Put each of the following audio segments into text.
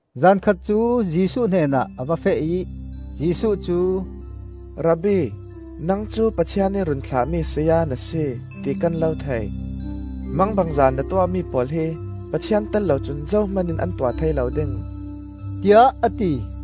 Zan khat cu Jesuh hnenah a va feh ih Jesuh cu, “Rabbi,#‘Rabbi’ timi cu ‘Sayapa’ tinak a si. nang cu Pathian ih run thlahmi saya na si, ti kan lo thei. Mangbangza na tuahmi pawl hi Pathian tel lo cun zohman in an tuah thei lo ding,” tiah a ti.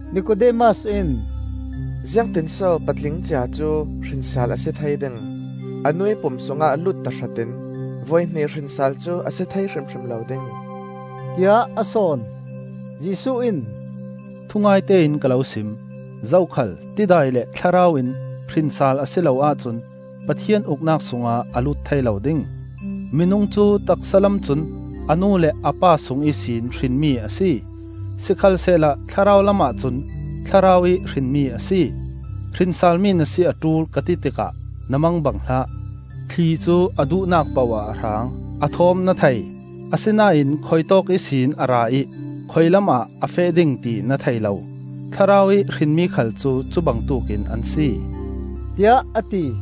Nikodemas in, “Ziangtin so patling cia cu hrin sal a si thei ding? A nuih pum sungah lut tahratin voihnih hrin sal cu a si thei hrimhrim lo ding,” tiah a sawn. Jesuh in, “Thungaite in ka lo sim: zokhal tidai le Thlarau in hrin sal a si lo ahcun Pathian Uknak sungah a lut thei lo ding. Minung cu taksa lam cun a nu le a pa sung ihsin hrinmi a si; sikhalsehla thlarau lamah cun Thlarau ih hrinmi a si. Hrin salmi na si a ṭul ka ti tikah na mangbang hlah. Thli cu a duhnak poh ah a hrang; a thawm na thei, asinain khuitawk ihsin a ra ih khuilamah a feh ding ti na thei lo. Thlarau ih hrinmi khal cu cubangtuk in an si,” tiah a ti.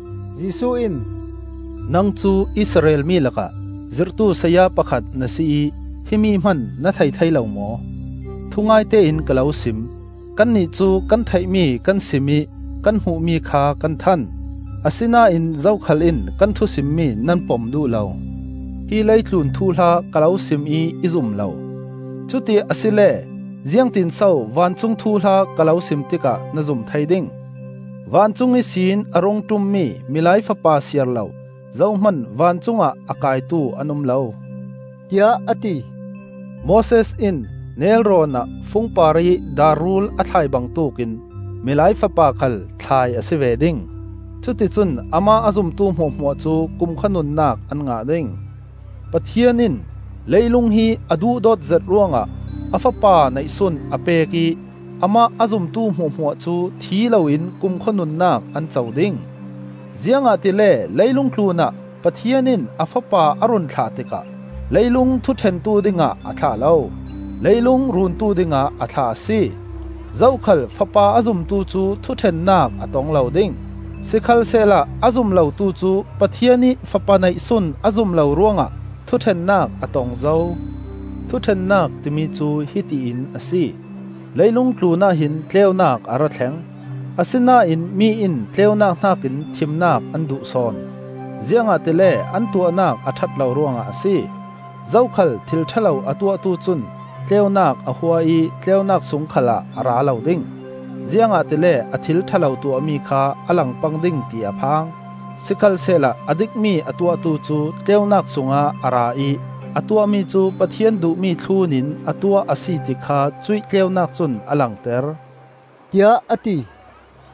Jesuh in, “Nang cu Israel mi lakah zirhtu saya pakhat na si ih himi hman na thei thei lo maw? Thungaite in ka lo sim: kannih cu kan theihmi kan sim ih kan hmuhmi kha kan than; asinain zokhal in kan thu simmi nan pom duh lo. Hi leitlun thuhla ka lo sim ih i zum lo; cuti asile ziangtinso vancung thuhla ka lo sim tikah na zum thei ding? Vancung ihsin a rung ṭummi Milai Fapa siarlo zohman vancungah a kaitu an um lo,” tiah a ti. “Moses in nelrawn ah fung parih dar rul a thlai bangtuk in Milai Fapa khal thlai a si ve ding; cuti cun amah a zumtu hmuahhmuah cu kumkhua nunnak an ngah ding. Pathian in leilung hi a duhdawt zet ruangah a Fapa neihsun a pek ih amah a zumtu hmuahhmuah cu thi loin kumkhua nunnak an co ding. Ziangahtile leilung tlunah Pathian in a Fapa a run thlah tikah leilung thuṭhentu dingah a thlah lo, leilung runtu dingah a thlah a si. Zokhal Fapa a zumtu cu thuṭhennak a tong lo ding; sikhalsehla a zum lotu cu Pathian ih Fapa neihsun a zum lo ruangah thuṭhennak a tong zo. Thuṭhennak timi cu hiti in a si: leilung tlunah hin tleunak a ra thleng, asinain mi in tleunak hnakin thimnak an duh sawn; ziangahtile an tuahnak a ṭhat lo ruangah a si. Zokhal thil ṭha lo a tuahtu cun tleunak a hua ih tleunak sung khal ah a ra lo ding, ziangahtile a thil ṭha lo tuahmi kha a lang pang ding ti a phang. Sikhalsehla a dikmi a tuahtu cu tleunak sungah a ra ih a tuahmi cu Pathian duhmi thlunin a tuah a si ti kha cuih tleunak cun a langter,” tiah a ti.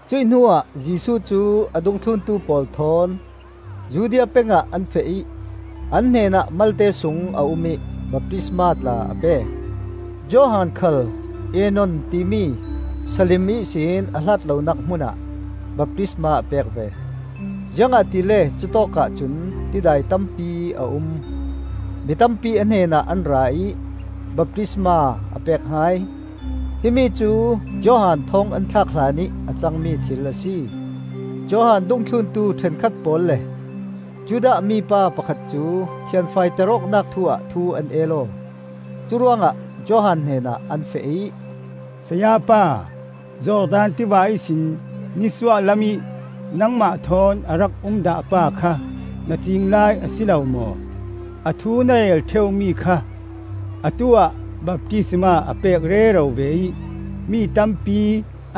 Cuih hnuah Jesuh cu a dungthluntu pawl thawn Judea peng ah an feh ih an hnenah malte sung a um ih baptisma tla a pek. Johan khal Aenon timi, Salim ihsin a hlat lonak hmun ah, baptisma a pek ve, ziangahtile cutawkah cun tidai tampi a um. Mi tampi a hnenah an ra ih baptisma a pek hai. Himi cu Johan thawng an thlak hlanih a cangmi thil a si. Johan dungthluntu ṭhenkhat pawl le Judah mipa pakhat cu thianfaiter awknak thu ah thu an el aw. Curuangah Johan hnenah an feh ih, “Sayapa, Jordan tiva ihsin nisuah lamih nangmah thawn a rak um dah pa kha na ciing lai a si lo maw? A thu na rel ṭheu mi kha! Atu-ah baptisma a pek rero ve ih mi tampi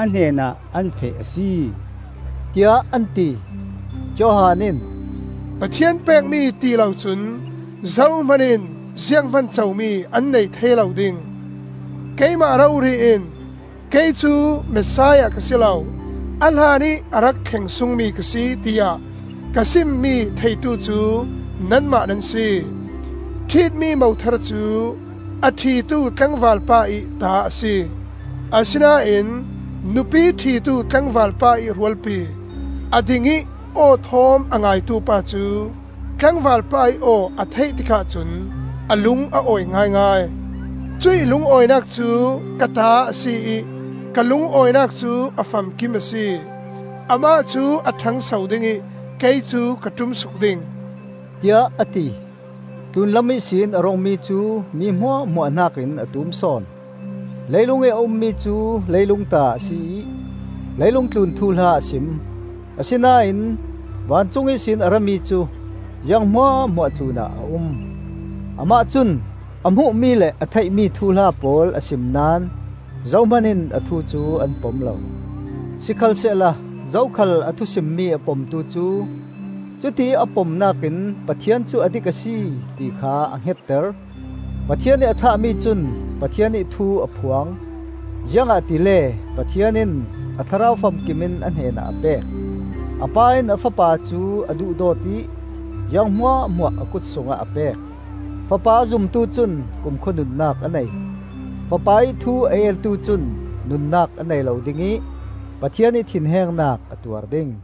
a hnenah an feh a si,” tiah an ti. Johan in, “Pathian pekmi ti lo cun zohman in zianghman comi an nei thei lo ding. Keimah rori in, ‘Kei cu Messiah ka si lo; a hlanih a rak thleng sungmi ka si,’ tiah ka simmi theitu cu nanmah nan si. Ṭhitmi mothar cu a ṭhitu tlangval pa ih ta a si; asinain nupi ṭhitu tlangval pa ih rualpi, a ding ih aw thawm a ngaitu pa cu, tlangval pa ih aw a theih tikah cun a lung a awi ngaingai. Cuih lungawinak cu ka ta a si ih ka lungawinak cu a famkim a si. Amah cu a ṭhangso ding ih kei cu ka ṭumsuk ding,” tiah a ti. Tlunlam ihsin a rungmi cu mi hmuahhmuah hnakin a tum sawn. Leilung ih a ummi cu leilung ta a si ih leilung tlun thuhla a sim; asinain vancung ihsin a rami cu ziang hmuahhmuah tlunah a um. Amah cun a hmuhmi le a theihmi thuhla pawl a sim naón zohman in a thu cu an pom lo. Sikhalsehla zokhal a thu simmi a pomtu cu cutiih a pomnak in Pathian cu a dik a si, ti kha a hngetter. Pathian ih a thlahmi cun Pathian ih thu a phuang, ziangahtile Pathian in a Thlarau famkim in a hnenah a pek. A pa in a Fapa cu a duhdawt ih ziang hmuahhmuah a kut sungah a pek. Fapa a zumtu cun kumkhua nunnak a nei; Fapa-ih thu a eltu cun nunnak a nei lo ding ih Pathian ih thinhengnak a tuar ding.